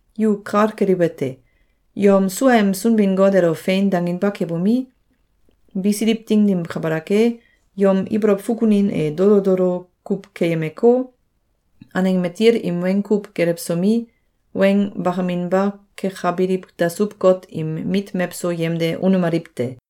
Yu kal keliwete: Yom suaem Sunbin-Got elo “Fein!”, danginba kebomi, bisiliw ding dim kabalak e, yom ibolow fukunin e dolo dolo kuw keyemeko, aneng matil im weng kuw gelewsomi, weng bakaminba kekabiliw dasuw-got im mit mewso yemde unemaliw te.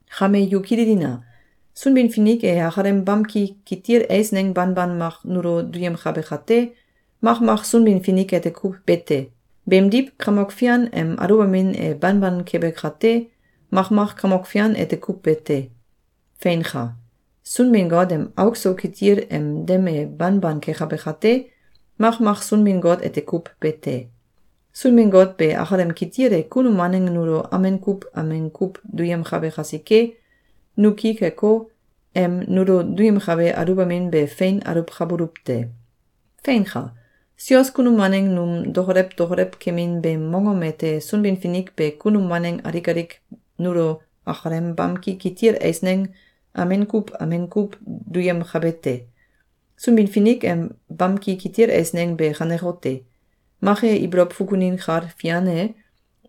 Kame yu kililina! Sunbin-Finik e akalem bamki kitil eisneng banban mak nulo duyemkabe kate, makmak Sunbin-Finik ete kuw be te. Beemdiw, Kamok Fian em aluwbamin e banban kebe kate, makmak Kamok Fian ete kuw be te. Feinka! Sunbin-Got em auk so kitil em dem e banban kekabe kate, makmak Sunbin-Got ete kuw be te. Sunbin-Got be akalem kitil e kunum waneng nulo amen kuw amen kuw duyemkabe kasike, nu ki keko, em nulo duyemkabe aluwbamin be fein aluwkabuluw te. Feinka! Sios kunum waneng num dokolew dokolew kemin beem mongom ete Sunbin-Finik be kunum waneng alik alik nulo akalem bamki kitil eisneng amen kuw amen kuw duyemkabe te. Sunbin-Finik em bamki kitil eisneng be kanekote: Mak e ibolow fukunin kal fian e,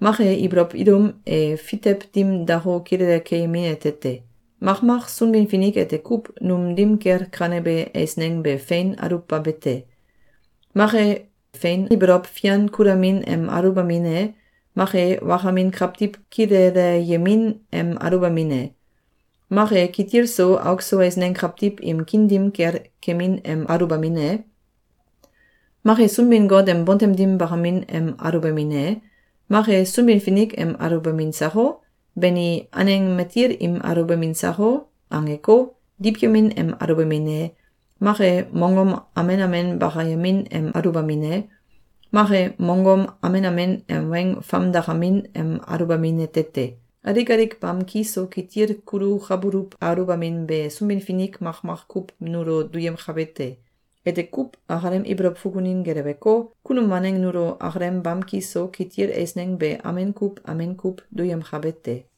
mak e ibolow ilum e fitew dim dako, kilele keyemin ete te. Makmak Sunbin-Finik ete kuw num dim kel kanebe eisneng be fein aluwbabete: Mak e, fein ibolow fian kulamin em aluwbamin e, mak e, wakamin kawtiw kileleyemin em aluwbamin e, mak e, kitil so auk so eisneng kawtiw im kiin dim kel kemin em aluwbamin e, mak e, Sunbin-Got em bontem dim bakamin em aluwbamin e, mak e, “Sunbin-Finik em aluwbamin sako? Bani, aneng matil im aluwbamin sako?”, angeko, diwyemin em aluwbamin e, mak e, mongom amen amen bakayemin em aluwbamin e, mak e, mongom amen amen em weng famdakamin em aluwbamin ete te. Alik alik bamki so kitil kulukabuluw aluwbamin be Sunbin-Finik makmak kuw nulo duyemkabe te. Ete kuw akalem ibolow fukunin geleweko, kunum waneng nulo akalem bamki so kitil eisneng be amen kuw amen kuw duyemkabe te.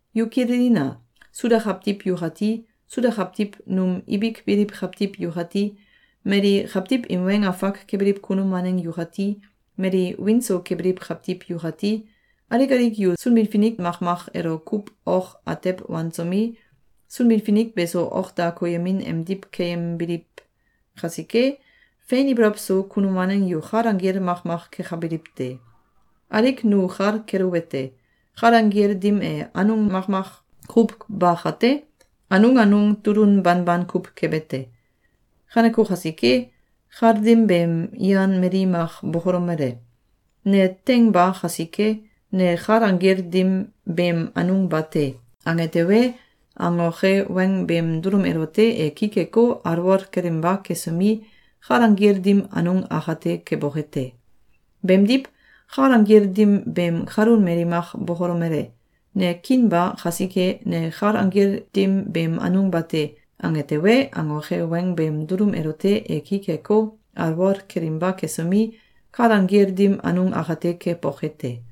Yu kililina! Suda kawtiw yukati, Suda kawtiw num ibik biliw kawtiw yukati, mali kawtiw im weng afak kebiliw kunum waneng yukati, mali wiin so kebiliw kawtiw yukati, alik alik yu Sunbin-Finik makmak elo kuw ok atew wansomi, Sunbin-Finik beso ok da koyemin emdiw keyembiliw kasike, fein ibolow so kunum waneng yu kal anggil makmak kekabiliw te. Alik nu kal keluwete: Kal anggil dim e anung makmak kuw ba kate, anung anung tulun banban kuw kebe te. Kaneko kasike, kal dim beem yan mali mak bokolomele: “Ne teing ba kasike, ne kal anggil dim beem anung ba te!”, ange tewe, angoke weng beem dulum elote e ki keko, alwol kelinba kesomi, kal anggil dim anung akate keboke te. Beemdiw, kal anggil dim beem kalun mali mak bokolomele: “Ne kiin ba kasike, ne kal anggil dim beem anung ba te!”, ange tewe, angoke weng beem dulum elote e ki keko, alwol kelinba kesomi, kal anggil dim anung akate keboke te.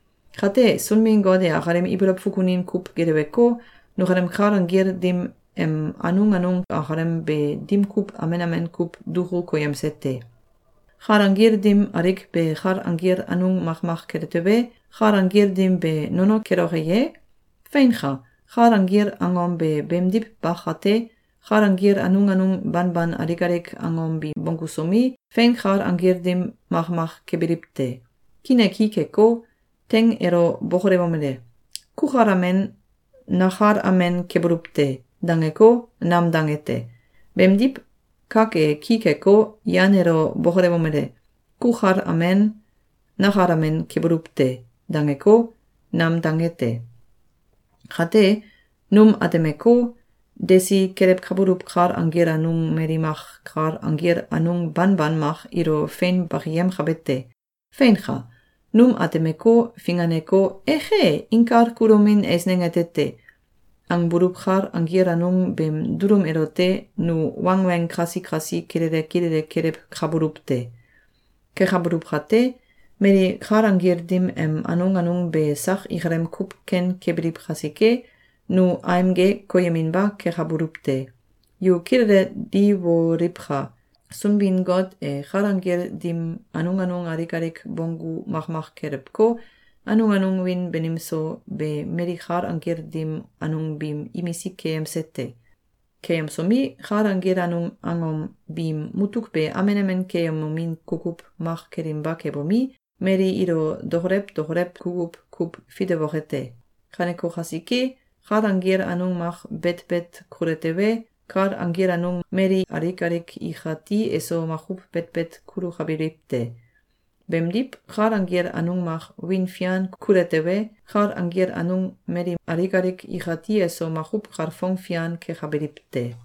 Kate, Sunbin-Got e akalem ibolow fukunin kuw geleweko, nukalem kal anggil dim em anung anung akalem be dim kuw amen amen kuw duku koyemse te. Kal anggil dim alik be kal anggil anung makmak kele tewe, kal anggil dim be nono keloke ye? Feinka! Kal anggil angom be beemdiw ba kate, kal anggil anung anung banban alik alik angom bi bonggusomi, fein kal anggil dim makmak kebiliw te. Kiin e ki keko, teing elo bokolewomele: “Kukal amen, nakal amen kebuluw te!”, dangeko, nam dange te. Beemdiw, kak e ki keko, yan elo bokolewomele: “Kukal amen, nakal amen kebuluw te!”, dangeko, nam dange te. Kate, num atemeko, desi kelewkabuluw kal anggil anung mali mak kal anggil anung banban mak ilo fein bakiyemkabe te. Feinka! Num atemeko, finganeko, “Eke! Inkal kulomin eisneng ete te!”, angbuluw kal anggil anung beem dulum elote nu wangweng kasi kasi kilele kilele kelewkabuluw te. Kekabuluw kate, mali kal anggil dim em anung anung be sak ikalem kuw ken kebiliw kasike, nu aimge koyeminba kekabuluw te. Yu kilele diwomliwka! Sunbin-Got e kal anggil dim anung anung alik alik bonggu makmak kelewko, anung anung wiin banim so be mali kal anggil dim anung biim imisik keyemse te. Keyemsomi, kal anggil anung angom biim mutuk be amen amen keyemomin kukuw mak kelinba kebomi, mali ilo dokolew dokolew kukuw kuw fitewoke te. Kaneko kasike, kal anggil anung mak betbet kule tewe, kal anggil anung mali alik alik ikati eso makuw betbet kulukabiliw te. Beemdiw, kal anggil anung mak wiin fian kule tewe, kal anggil anung mali alik alik ikati eso makuw kalfong fian kekabiliw te.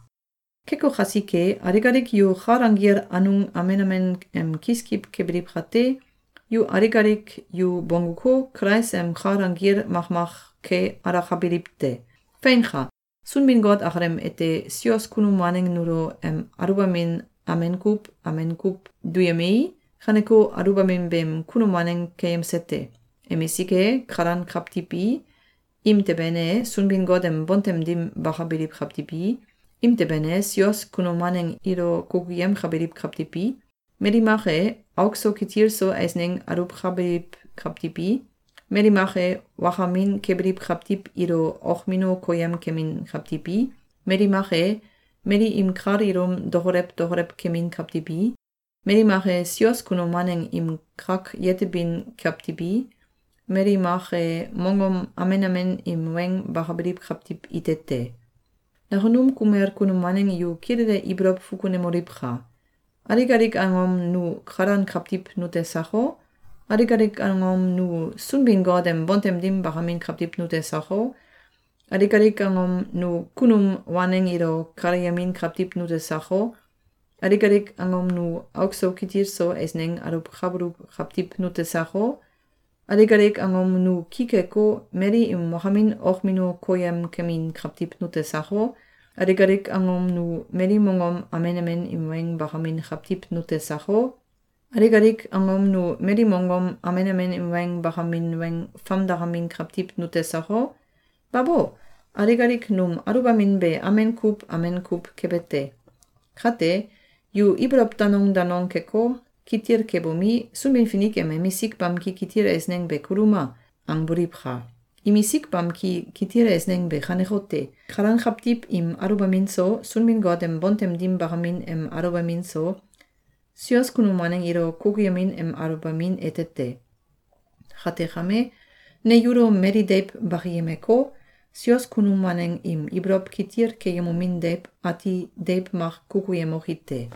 Keko kasike, alik alik yu kal anggil anung amen amen em kiskiw kebiliw kate, yu alik alik yu bongguko, Kulais em kal anggil makmak ke alakabiliw te. Feinka! Sunbin-Got akalem ete sios kunum waneng nulo em aluwbamin amen kuw amen kuw duyemei, kaneko aluwbamin beem kunum waneng keyemsete: Emisik e, kalan kawtiw i, imteben e, Sunbin-Got em bontem dim bakabiliw kawtiw i, imteben e, sios kunum waneng ilo kukuyemkabiliw kawtiw i, mali mak e, auk so kitil so eisneng aluwkabiliw kawtiw i, mali mak e, wakamin kebiliw kawtiw ilo okmino koyem kemin kawtiw i, mali mak e, mali im kal ilum dokolew dokolew kemin kawtiw i, mali mak e, sios kunum waneng im kak yetebin kawtiw i, mali maki e, mongom amen amen im weng bakabiliw kawtiw ite te. Nakunum kumel kunum waneng yu kilele ibolow fukunemoliwka! Alik alik angom nu kalan kawtiw nute sako? Alik alik angom nu Sunbin-Got em bontem dim bakamin kawtiw nute sako? Alik alik angom nu kunum waneng ilo kaleyemin kawtiw nute sako? Alik alik angom nu auk so kitil so eisneng aluwkabuluw kawtiw nute sako? Alik alik angom nu ki keko, mali im wakamin okmino koyemkemin kawtiw nute sako? Alik alik angom nu mali mongom amen amen im weng bakamin kawtiw nute sako? Alik alik angom nu mali mongom amen amen im weng bakamin weng famdakamin kawtiw nute sako? Babo! Alik alik num aluwbamin be amen kuw amen kuw kebe te. Kate, yu ibolow danong danong keko, kitil kebomi, “Sunbin-Finik em emisik bamki kitil eisneng be kuluma!”, angboliwka! Imisik bamki kitil eisneng be kanekote: Kalan kawtiw im aluwbamin so, Sunbin-Got em bontem dim bakamin em aluwbamin so, sios kunum waneng ilo kukuyemin em aluwbamin ete te. Kate kame, ne yulo mali deiw bakiyemeko, sios kunum waneng im ibolow kitil keyemomin deiw ati deiw mak kukuyemoki te.